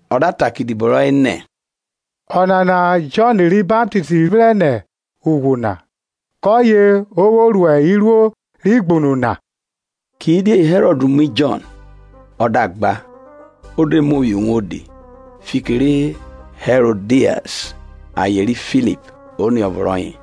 Ọ da ta kẹ idibo rọye nẹ, Ọnana Jọn ri Baptist ri vrẹn nẹ ughwu na, kọye o vwo ru iruo rẹ igbunu na. Kidie Hẹrọd mu Jọn, ọ da gba, o de muo phihọ uwodi, fiki ri Hẹrodias aye ri Filip oniọvo rọye.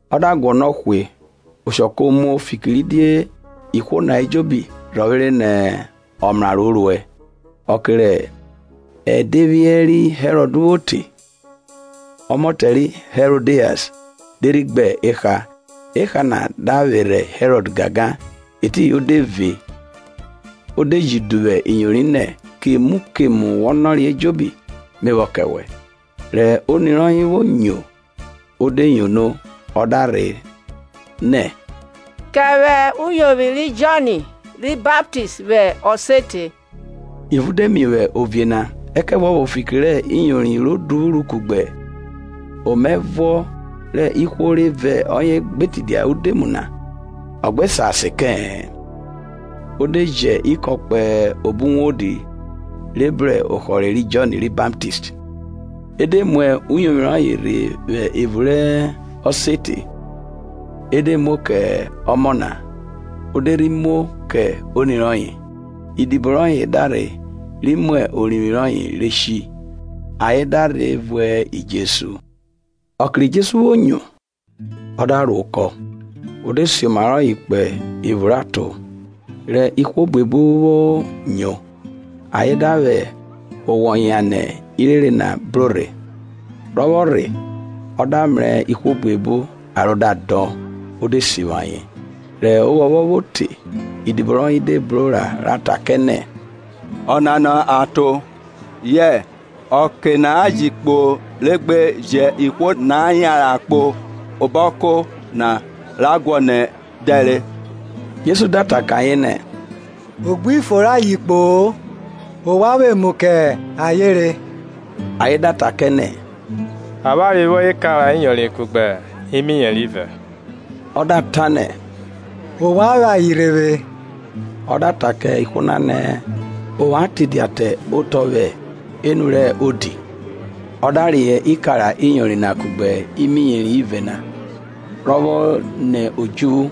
Ọ da guọnọ hwe, oshọ ko muo, fikiridie ihwo na ejobi rhọvwere nẹ ọmraro o ruẹ. Ọke rẹ ẹdevwiẹ ri Hẹrọd vwo te, ọmọtẹ ri Hẹrọdias de rhi gbe eha, eha na da vwerhe Hẹrọd gangan. Etiyin o de ve, o de ji duvwu iyori nẹ, kemu kemu wọ nọre ejobi me vwọ kẹ wẹ. Rẹ oni rọye vwo nyo, ọ de yono, ọ da rhe nẹ, kẹ vwẹ uyovwi ri Jọn ri Baptist vwẹ ọsete. Ivun de miovwi ovie na; ẹkẹvuọvo fiki rẹ iyori ro duvwuru kugbe omaẹvuọ rẹ ihwo re vẹ ọye gbe tidia udemu na, ọ gbe sa sen kẹ-ẹ. O de ji ikọn kpo obo uwodi re bru ohọre ri Jọn ri Baptist. E de mu uyovwi rọye rhe vwẹ evun rẹ ọsete, e de muo kẹ ọmọ na, o de re muo kẹ oni rọye. Idibo rọye da rhe ri mu orivwi rọye re shi; ayen da rhe vuẹ Jesu. Ọke ri Jesu vwo nyo, ọ da ro okọ; ọ da reyọ oma kpo evun rẹ aton; rẹ ihwo buebu na vwo nyo, ayen da vwẹ owọ yan nẹ irere na bro rhe. Rọ vwo rhe, ọ da mrẹ ihwo buebu, aro da dọn, o de sivwi ayen. Rẹ ovwọnvwọn vwo te, idibo rọye de bro ra ta kẹ nẹ, Ọnana aton, yẹ ọke na ji kpo re gbe jẹn ihwo na yanran kpo obo ọko na ra guọnọ emu dẹ rẹ. Jesu da ta kẹ ayen nẹ, o gbi fo re ayen kpo-o; ovwan vwẹ emu kẹ ayen re. Ayen da ta kẹ nẹ, avwanre vwo ikara iyori kugbe imiyeri ivẹ. Ọ da ta nẹ, ovwan vwẹ ayen rhe vwe. Ọ da ta kẹ ihwo na nẹ, ovwan tidia te otọ vwẹ enu rẹ odi; ọ da reyọ ikara iyori na kugbe imiyeri ivẹ na, ro vwo ni odjuvwu,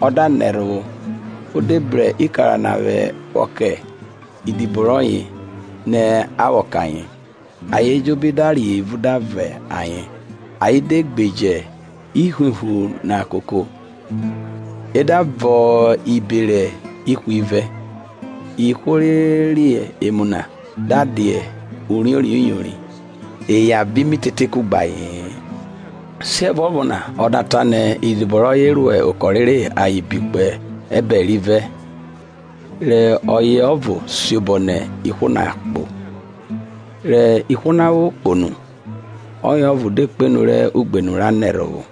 ọ da nẹ ẹrhovwo, o de bru ikara na vwọ kẹ idibo rọye nẹ a vwọ kẹ ayen. Ayen ejobi da re evun da vọn ayen, ayen de gbeje ivwuvwu na koko, e da vọn ibere ihwivẹ. Ihwo re re emu na da dia uriori iyori, eya vẹ imitete kugbe aye-en. Siẹvuọvo na o da ta nẹ idibo rọye rọ okọ rere ayen bi kpo ẹbẹre rivẹ, re ọye ọvo siobọ nẹ ihwo na kpo. Rẹ ihwo na vwo kpo nu, ọye ọvo de kpenu rẹ ugbenu ra nẹ ẹrhovwo;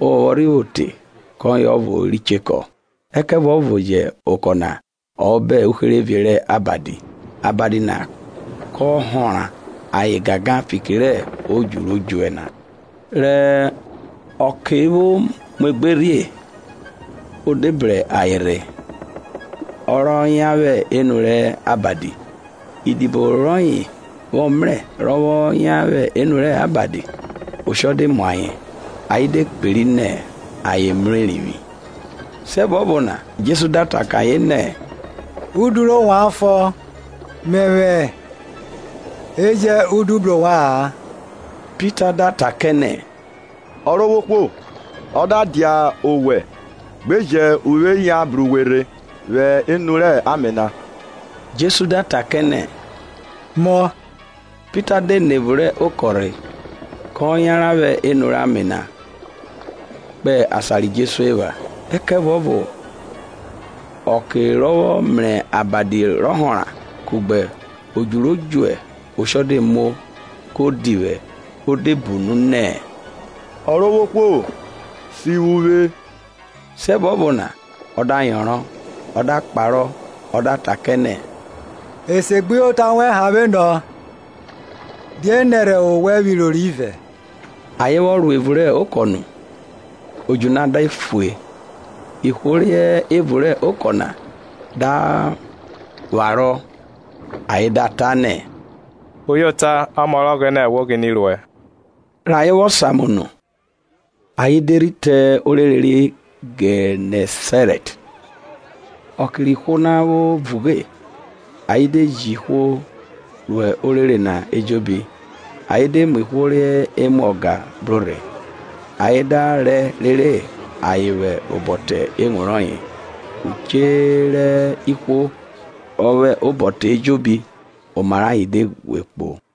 ovwọnvwọn rhi vwo te, kọye ọvo ri chekọ. Ẹkẹvuọvo yẹ okọ na hẹ obọ uherevie rẹ abadi, abadi na kọ họnra ayen gangan, fiki rẹ odju ro djuẹ na. Rẹ ọke vwo muegbe rhie, o de bru ayen rhe, ọ rọ yan vwẹ enu rẹ abadi. Idibo rọye vwọ mrẹ rọ vwọ yan vwẹ enu rẹ abadi, oshọ de mu ayen, ayen de kperi nẹ ayen mrẹ erivwi. Siẹvuọvo na Jesu da ta kẹ ayen nẹ, udu rẹ ovwan fọ, Mẹvwẹ e jẹn udu bru ovwa-an. Pita da ta kẹ nẹ, Ọrovwohwo, ọ da dia owẹ, gbe jẹn uvwe yan bru we rhe vwẹ enu rẹ ame na. Jesu da ta kẹ nẹ, Mo. Pita de nẹ evun rẹ okọ rhe, ko yanran vwẹ enu rẹ ame na, kpo asan ri Jesu epha. Ẹkẹvuọvo ọke rọ vwọ mrẹ abadi rọ họnra kugbe odju ro djuẹ, oshọ de muo; ko divwẹ, o de bunu nẹ, Ọrovwohwo sivwi uvwe. Siẹvuọvo na ọ da yọnrọn, ọ da kparọ, ọ da ta kẹ nẹ, esegbuyota wẹn hanvwe nọ, die nẹrhẹ owẹ vwo iroro ivẹ? Ayen vwọ ro evun rẹ okọ nu, odju na de fue. Ihwo re hẹ evun rẹ okọ na da vwarọ, ayen da ta nẹ, Uyota, ọmọ rẹ Ọghẹnẹ wo ghine ruẹ. Rẹ ayen vwọ samu nu, ayen de rhi te orere ri Gẹnẹsarẹt. Ọke rẹ ihwo na vwo vughe, ayen de ji ihwo ro orere na ejobi, ayen de mu ihwo re mwa ọga bro rhe; ayen da rẹ rere ayen vwẹ obọ te ewun rọye; uche ihwo re vwẹ obọ te ejobi, oma rẹ ayen de ghwe kpo.